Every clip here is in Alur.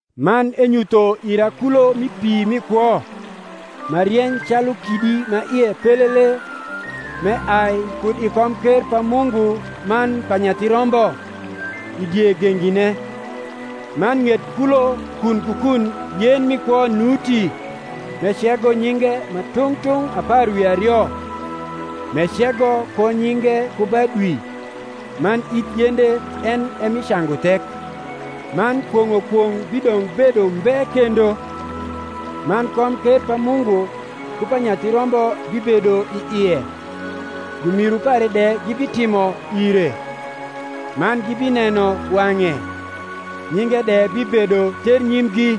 Man enyutho ira kulo mi pi mi kwo, ma rieny calu kidi ma ie pelele, m’eai kud i komker pa Mungu man pa Nyathi Rombo, i die gengine. Man ng’et kulo kun ku kun yen mi kwo nuti, m’ecego nyinge ma tung’ tung’ apar wi ario, m’ecego ko nyinge ku ba dwi: man ith yende en e mi cangu thek. Man kwong’o kwong’ bidong’ bedo umbe kendo: man komker pa Mungu ku pa Nyathi Rombo bibedo i ie: jumiru pare de gibitimo ire; man gibineno wang’e; nyinge de bibedo ternyimgi.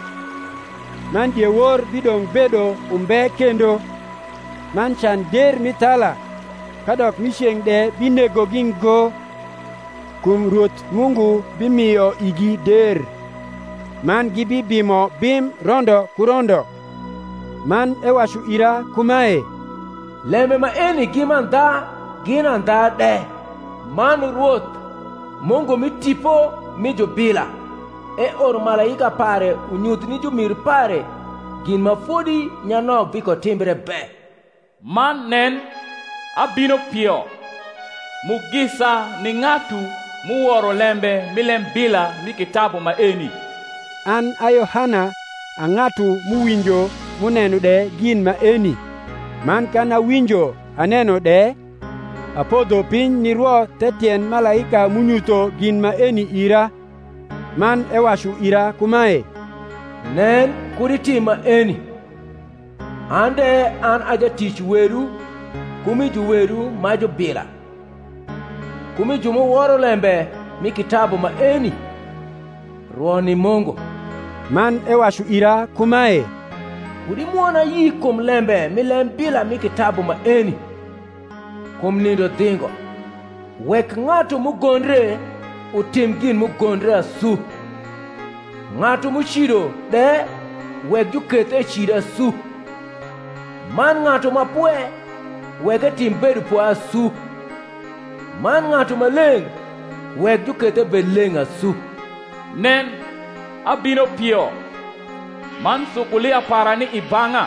Man diewor bidong’ bedo umbe kendo; man can der mi thala, kadok mi ceng’ de binegogi ngo; kum Rwoth Mungu bimio igi der: man gibibimo bim rondo ku rondo. Man ewacu ira kuma, Lembe maeni gi mandha gin andha de: Rwoth, Mungu mi tipo mi jubila, eoro malaika pare unyuth ni jumiru pare gin ma fodi nyanok bikotimbre be. Man nen, abino pio. Mugisa ni ng’atu m’uworo lembe mi lembila mi kitabu maeni. An a Yohana a ng’atu m’uwinjo m’uneno de gin maeni. Man kan awinjo aneno de, apodho piny nirwo the tiend malaika m’unyutho gin maeni ira. Man ewacu ira kumae, Nen kud itim maeni: an de an a jatic wedu ku mi juwedu ma jubila, ku mi ju m’uworo lembe mi kitabu maeni: rwo ni Mungu. Man ewacu ira kumae, Kud imwon ayi kum lembe mi lembila mi kitabu maeni; kum nindo dhingo. Wek ng’atu m’ugondre, utim gin m’ugondre asu: ng’atu m’ucido de, wek juketh ecid asu: man ng’atu ma pwe, wek etim bedopwe asu: man ng’atu maleng’, wek juketh ebed leng’ asu. Nen, abino pio; man sukulia para ni i bang’a,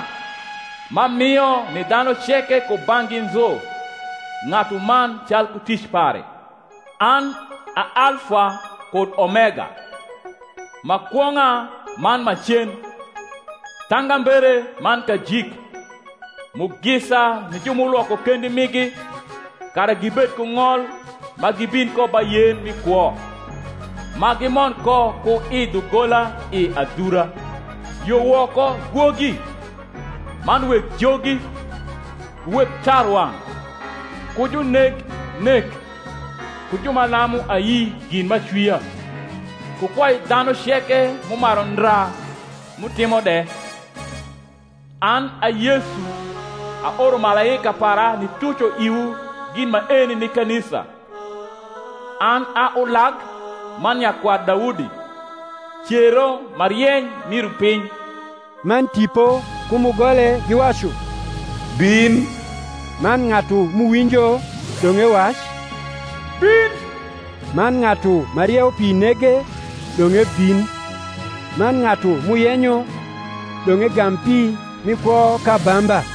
m’amio ni dhanu ceke kubang’gi nzu ng’atuman calku tic pare. An a Alfa kud Omega, ma kwong’a man ma cen, thangambere man kajik. Mugisa ni ju m’ulwoko kendi migi, kara gibed ku ng’ol ma gibin ko ba yen mi kwo, ma gimond ko ku i dhugola i adhura. Yo woko gwogi, man weg jogi, ku weg tarwang’, ku juneg nek, ku ju ma lamu ayi gin m’acwia, ku kwai dhanu ceke m’umaru ndra m’utimo de. An a Yesu aoro malaika para nituco iwu gin maeni ni kanisa. An a ulag man nyakwar Daudi, cero ma rieny, mi rupiny. Man Tipo ku mugole giwacu, Bin. Man ng’atu m’uwinjo, dong’ ewac, Bin. Man ng’atu ma rieupi nege, dong’ ebin: man ng’atu m’uyenyo, dong’ egam pi mi kwo k’abamba.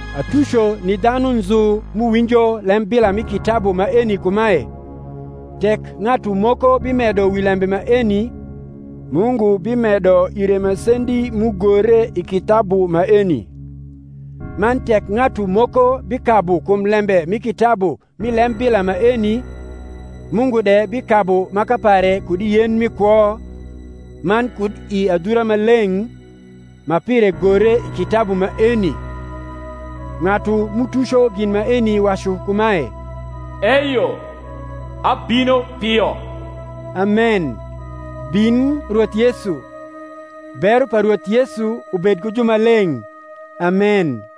Atuco ni dhanu nzu m’uwinjo lembila mi kitabu maeni kumae, Tek ng’atu moko bimedo wi lembe maeni, Mungu bimedo ire masendi m’ugore i kitabu maeni: man tek ng’atu moko bikabu kum lembe mi kitabu mi lembila maeni, Mungu de bikabu maka pare kud i yen mi kwo, man kud i adhura ma leng’, ma pire gore i kitabu maeni. Ng’atu m’utuco gin maeni wacu kumae, Eyo, abino pio. Amen. Bin Rwoth Yesu. Bero pa Rwoth Yesu ubed ku jumaleng’. Amen.